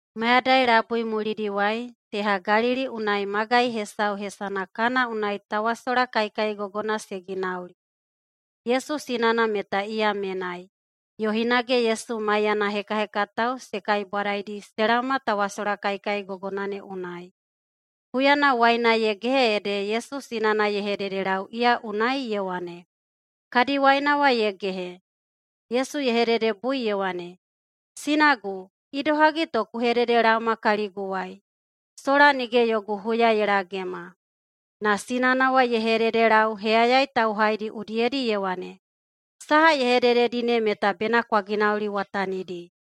Mayadai labui mulidiwai, teha Galili unai magai hesau hesana Kana unai tawasola kaikaigogona se ginauli. Yesu sinana meta iya menai, yo hinage Yesu maiyana hekahekatao se kaibwadaidi se laoma tawasola kaikaigogona ne unai. Huyana waina ye gehe ede Yesu sinana ye hededelau iya unai ye wane, “Kadi waina wa ye gehe.” Yesu ye hededebui ye wane, “Sinagu, idohagi to ku hededelaoma kaliguwai? Sola nige yogu huya ye lagema.” Na sinana wa ye hededelau heyayai tauhaidi udiyedi ye wane, “Saha ye hedededi ne meta bena kwa ginauliwatanidi.”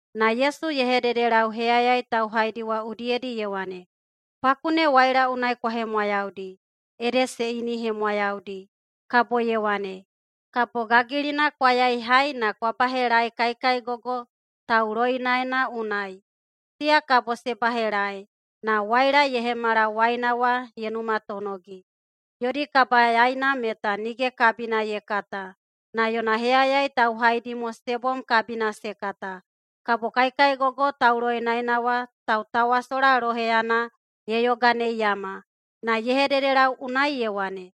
Na Yesu ye hededelau heyayai tauhaidi wa udiyedi ye wane, “Paku ne waila unai kwa hemwayaudi”, ede se inihemwayaudi. Kabo ye wane, “Kabo gagilina kwa yaihai na kwa bahelaei kaikaigogo tauloinaena unai.” Siya kabo se bahelaei na waila ye hemala waina wa ye numatonogi. Yodi kabayaina meta nige kabina ye kata, na yona heyayai tauhaidi mo se bom kabina se kata. Kabo kaikaigogo tauloinaena wa tautawasola loheyana ye yoganeiyama na ye hededelau unai ye wane,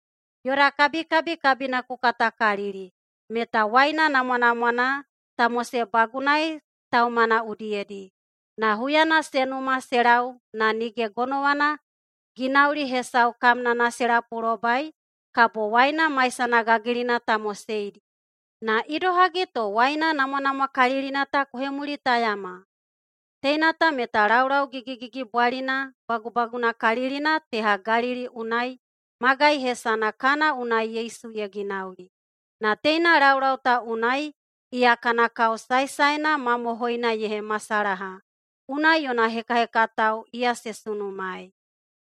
“Yoda kabikabi kabina ku katakalili, meta waina namwanamwana ta mosebagunai taumana udiyedi. Na huyana se numa se lau na nige gonowana ginauli hesau kamnana se lapulobai kabo waina maisana gagilina ta moseidi. Na idohagi to waina namwanamwakalilina ta ku hemulitayama?” Teina ta meta laulau gigigigibwalina bagubagunakalilina teha Galili unai magai hesana Kana unai Yesu ye ginauli. Na teina laulau ta unai iya kana kao saesaena mamohoina ye hemasalaha, unai yona hekahekatao iya se sunumaei.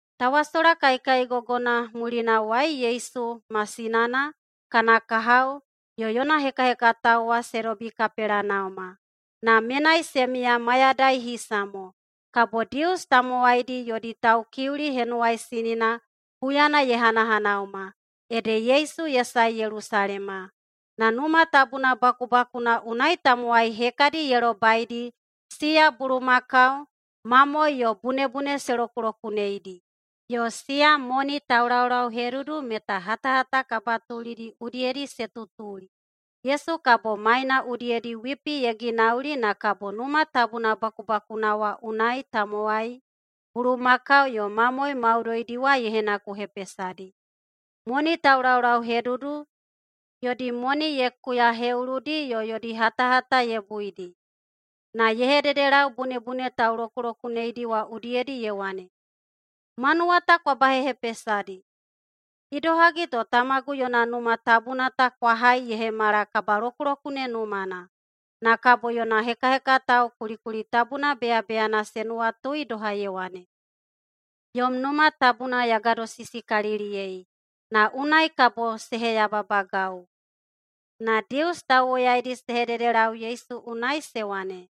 Tawasola kaikaigogona mulinawai Yesu ma sinana, kana kahao yo yona hekahekatao wa se dobi Kapelenauma, na menai se miya mayadai hisa mo. Kabo Dius tamowaidi yodi Taukiuli Henuwaisinina huyana ye hanahanauma, ede Yesu ye sae Yelusalema. Na Numa Tabuna bakubakuna unai tamowai hekadi ye lobaidi siya bulumakau, mamoe yo bunebune se lokulokuneidi, yo siya moni taulaulauhedudu meta hatahata kabatulidi udiyedi se tutuli. Yesu kabo maina udiyedi wipi ye ginauli na kabo Numa Tabuna bakubakuna wa unai tamowai, bulumakau yo mamoe maudoidi wa ye henakuhepesadi. Moni taulaulauhedudu yodi moni ye kuyaheꞌuludi yo yodi hatahata ye buidi. Na ye hededelau bunebune taulokulokuneidi wa udiyedi ye wane, “Manuwa ta kwa bahehepesadi! Idohagi to tamagu yona Numa Tabuna ta kwa hai ye hemala kabalokulokune numana!” Na kabo yona hekahekatao kulikuli tabuna beyabeyana se nuwatui doha ye wane, “Yom Numa Tabuna ya gadosisikaliliyei, na unai kabo se heyababagau.” Na Dius tauwoyaidi se hededelau Yesu unai se wane,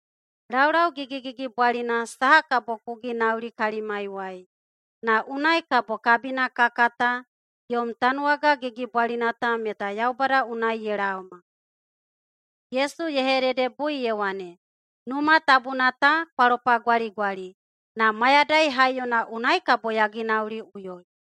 “Laulau gigigigibwalina saha kabo ku ginauli kalimaiwai, na unai kabo kabina ka kata yom tanuwaga gigibwalina ta meta Yaubada unai ye laoma?” Yesu ye hededebui ye wane, “Numa tabuna ta kwa lopagwaligwali, na mayadai haiyona unai kabo ya ginauliꞌuyoi.”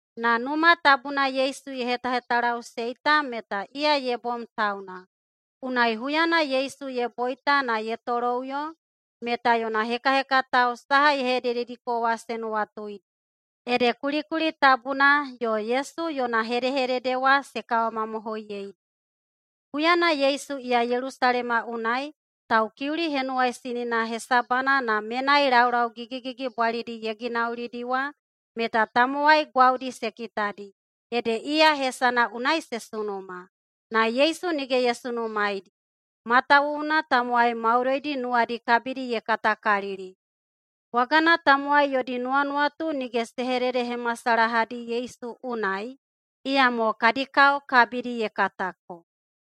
Na Numa Tabuna Yesu ye hetahetalaꞌusei ta meta iya ye bom tauna. Unai huyana Yesu ye boita na ye toloꞌuyo meta yona hekahekatao saha ye hededediko wa se nuwatuidi, ede kulikuli tabuna yo Yesu yona hedehedede wa se kawamamohoiyeidi. Huyana Yesu iya Yelusalema unai Taukiuli Henuwaisinina hesabana na menai laulau gigigigibwalidi ye ginaulidi wa meta tamowai gwaudi se kitadi, ede iya hesana unai se sunuma. Na Yesu nige ye sunumaeidi, matawuwuna tamowai maudoidi nuwadi kabidi ye katakalili. Bwagana Tamowai yodi nuwanuwatu nige se hededehemasalahadi Yesu unai, iyamo kadi kao kabidi ye katako.